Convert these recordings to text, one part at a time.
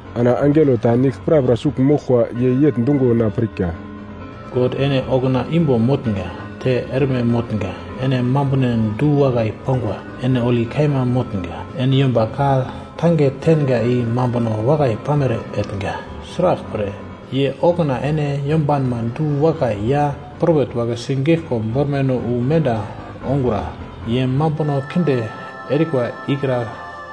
Ana angelo ta nigl prapra sugl moglkwa ye yegl dungo na pirka: “God ene okuna imbo motnga, te erme motnga. Ene mambunon du-wakai pangwa, ene holi kaima motnga. Ene yomba ka-tange tenga i mambuno wakai pamere etnga. Sraglpre, ye okuna ene yombanma du-wakai ya propet wagle sigeglko bormaino wu menda ongura. Ye mambuno kinde erikwa ikra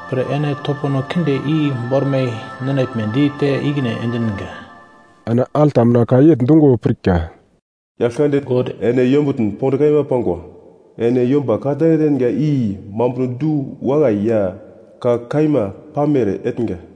pre ene topono kinde i bormai ninaglmedi te ikine endinga.” Ana alta mina ka yegl dungo pirka: “Yaglkande God, ene yombutn pond kaima pangwa. Ene yomba ka-tange tenga i mambuno du-wakai ya ka kaima pamere etnga.”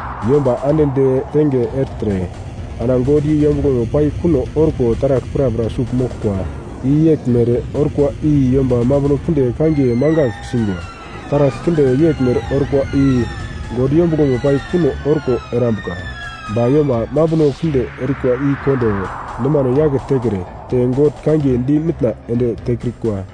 Yomba ande detenge ertre ana God i yombuglomo pai kuno orko taragl prapra sugl moglkwa i yeglmere orkwa i yomba mambuno kinde kangiye mangagl singwa. Taragl kinde yeglmere orkwa i God yombuglomo pai kuno orko erambuka. Ba yomba mambuno kinde erikwa i kondo nomano yake tekre te God kangiye di mitna ende tekrikwa.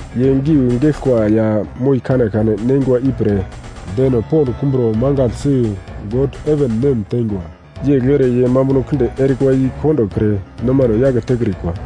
Ye giu geglkwa ya moi kanekane neingwa ipre deno pond kumbro mangaglsi God heven nem teingwa. Yegl ere ye mambuno kinde erikwa i kondokre nomano yake tekrikwa.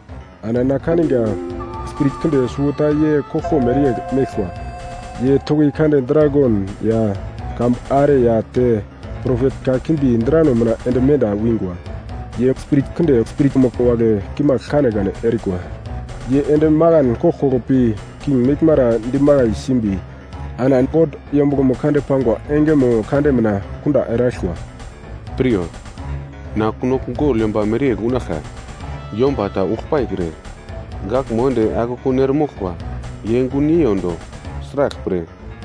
Ana na kaniga spirit kinde suwota ye koglko mereyegl meglkwa, ye toki kande dragon ya kambu are ya te propet kakimbi drano mina ende menda wingwa. Ye spirit kinde spiritmo wagle kimagl kanekane erikwa, ye ende makan koglkoglo pi king meglmara dimakai simbi ana God yombuglomo kande pangwa engemo kande mina kunda eraglkwa. “Piryo! Na kunogl gogl yomba mereyegl unaglkwa! Yomba ta ugl paikre, gaglmo ende ana akekun eremoglkwa, ye gun yeiyondo. Sraglpre,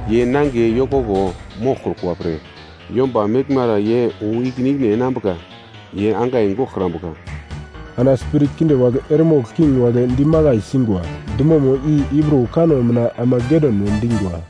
ye nangiye yokoko moglkrukwa pre yomba meglmara ye wu ikine ikine enambuka, ye angai goglkrambuka.” Ana spirit kinde wagle eremogl king wagle dimakai singwa, dumomo i Hibru kanno mina Amagedon we dingwa.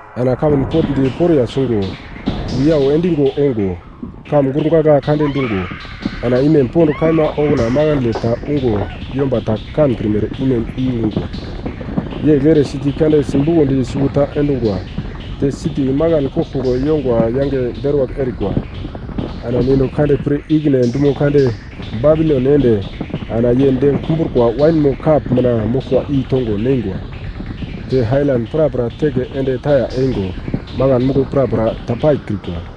Ana kamun potndi poriya sungo, wiyau endigo ongo, kamun gurgagla kande dungo, ana imem pond kaima okuna makandle ta ungo yomba ta kankrimere imem i ungwa. Yegl ere siti kande sibukondi suwota endungwa, te siti makan koglkoglo yongwa yange deruwagl erikwa. Ana God pir ikine dumo kande Babilon ende ana ye dem kumbrukwa wainmo kap mina moglkwa i tongo neingwa. Te ailan prapra teke ende taya eingo, makan muglo prapra ta paikrikwa.